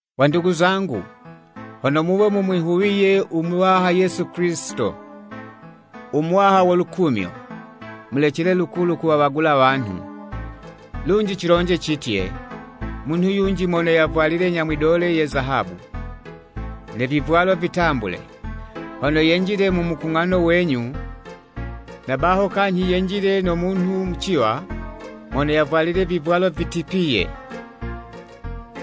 Wandugu zangu, hono muwe mumwihuwiye u Muwaha Yesu Kilisito, u Muwaha wo lukumyo, mulecele lukulu kuwawagula wanhu. Lunji cilonje citye, munhu yunji mono yavwalile nyamwidole ye zahabu, ne vivwalo vitambule, hono yenjile mu mukung'ano wenyu, na baho kanyhi yenjile no munhu muciwa mono yavwalile vivwalo vitipiye.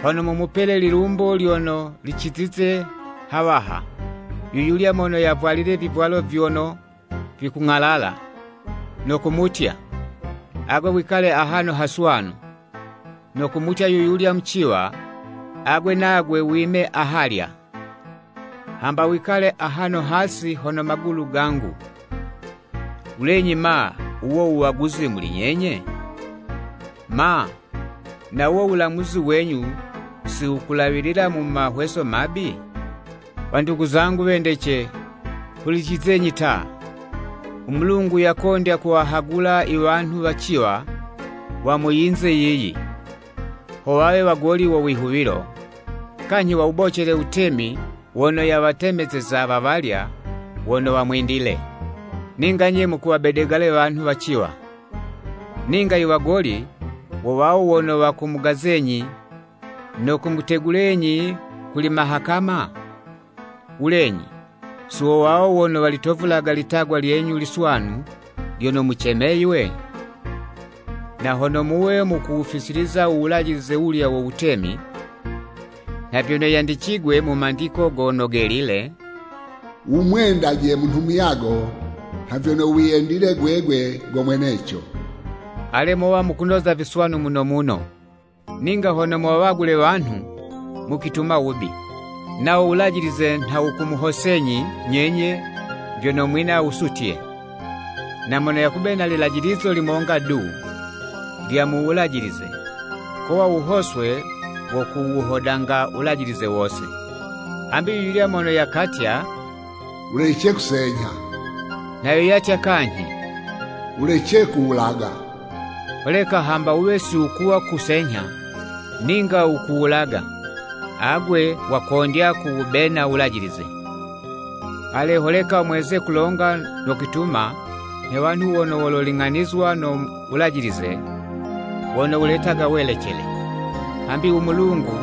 Hono mumupele lilumbo lyono licizize hawaha, yuyulya mono yavwalile vivwalo vyono vikung'alala, no kumutya, “Agwe wikale ahano haswanu,” no kumutya yuyulya muciwa, “Agwe nagwe wime ahalya,” hamba “Wikale ahano hasi hono magulu gangu,” wulenyi ma, wuwo wuwaguzi muli nyenye? Ma, na wuwo wulamuzi wenyu si wukulawilila mu mahweso mabi? Wandugu zangu, wendece, hulicizenyi ta! U Mulungu yakondya kuwahagula iwanhu waciwa wa mu yinze yiyi, ho wawe wagoli wo wihuwilo, kanyhi wawubocele wutemi wono yawatemezeza wa walya wono wamwendile. Ninga nye mukuwabedegala wanhu waciwa! Ninga iwagoli wo wawo wono wakumugazenyi no kumutegulenyi kuli Mahakama? Wulenyi, si wo wawo wono walitovulaga litagwa lyenyu liswanu lyono mucemeywe? Na hono muwe mukuwufisiliza u wulajilize wulya wo Wutemi, nha vyono yandicigwe mu Mandiko Gono Gelile: “Wumwendaje munhu muyago nha vyono wiyendile gwegwe go mweneco,” ale mowa mukunoza viswanu muno muno. Ninga hono muwawagule wanhu, mukwituma wubi, nawo Wulajilize nha wukumuhosenyi nyenye vyono mwina wusutye. Na mono yakubena lilajilizo limonga du lya mu Wulajilize, kowa wuhoswe wo kuwuhodanga Wulajilize wose. Hambi yu yulya mono yakatya, “Wulece kusenyha,” nha yo yatya kanyhi “Wulece kuwulaga.” Holeka hamba wuwe siwukuwa kusenyha, ninga wukuwulaga, agwe wakondya kuwubena wulajilize. Ale, holeka mweze kulonga no kwituma nhe wanhu wono wololing'anizwa no Wulajilize wono wuletaga welecele. Hambi, u Mulungu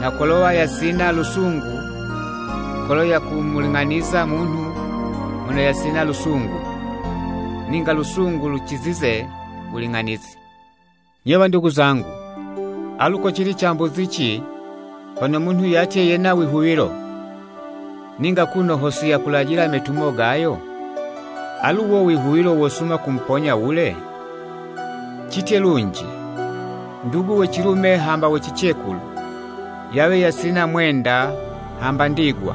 nha kolowa yasina lusungu kolo yakumuling'aniza munhu mono yasina lusungu. Ninga lusungu lucizize wuling'anizi. Nye wandugu zangu, alu kocili cambuzici, hono munhu yatye yena wihuwilo, ninga kuno ho siyakulajila imetumo gayo? Alu wuwo wihuwilo wosuma kumuponya wule? Citye lunji, ndugu we cilume hamba we cicekulu yawe yasina mwenda hamba ndigwa.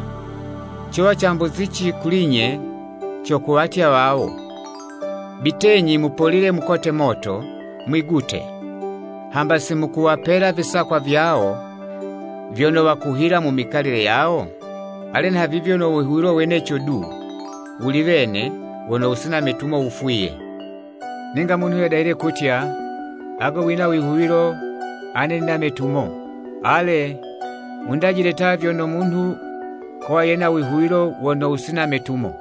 Cowa cambuzici kuli'nye co kuwatya wawo, “Bitenyi mupolile mukote moto, mwigute,” hamba simukuwapela visakwa vyawo vyono wakuhila mu mikalile yawo? Ale nhavivyo no wihuwilo weneco du wuli wene wono wusina metumo, wufwiye. Ninga munhu yadahile kutya, “Agwe wina wihuwilo, ane nina metumo!” Ale! Wundajile ta vyono munhu kowa yena wihuwilo wono wusina metumo,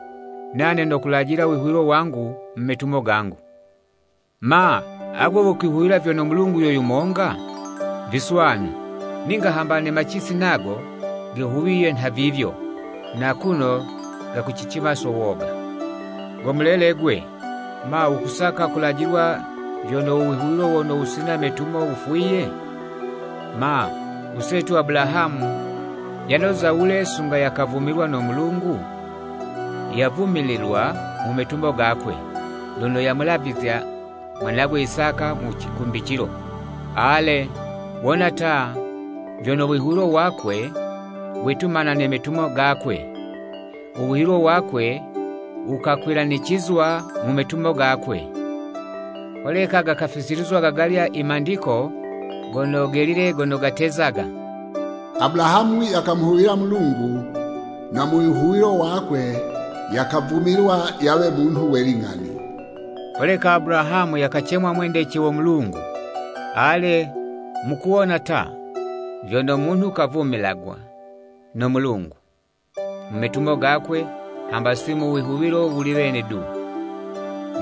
nane nokulajila wihuwilo wangu mu metumo gangu. Ma, agwe wukwihuwila vyono Mulungu yo yumonga? Viswanu! Ninga hamba ne macisi nago gehuwiye nhavivyo, na kuno gakucicima so woga. Go mulele 'gwe, ma, wukusaka kulajilwa vyono u wihuwilo wono wusina metumo wufwiye? Ma, usetu Abulahamu yanoza wule sunga yakavumilwa no Mulungu? Yavumililwa mu metumo gakwe, lono yamulavizya mwanagwe Isaka mu cikumbicilo. Ale, wona ta, vyono wihuwilo wakwe, wetumana ne metumo gakwe, u wihuwilo wakwe wukakwilanicizwa mu metumo gakwe. Holeka gakafisilizwa gagalya i Mandiko Gono Gelile gono gatezaga: “Abulahamu yakamwihuwilo Mulungu, na mu wihuwilo wakwe, yakavumilwa yawe munhu we ling'ani, holeka Abulahamu yakacemwa mwendece wo Mulungu.” Ale, mukuwona ta, vyono munhu kavumilwaga no Mulungu mu metumo gakwe hamba si mu wihuwilo wuli wene du.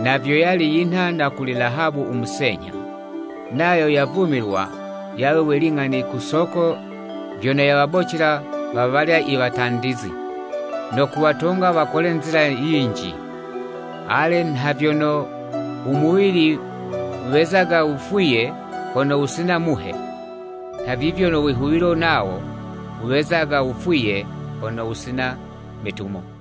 Na vyo yali yinha na kuli Lahabu u musenyha, nayo yavumilwa yawe we ling'ani ku soko vyono yawabocela wa walya i watandizi, no kuwatonga wakole nzila yinji. Ale, nha vyono umuwili wezaga wufwiye hono wusina muhe, nhavivyo no wihuwilo nawo, wezaga wufwiye hono wusina metumo.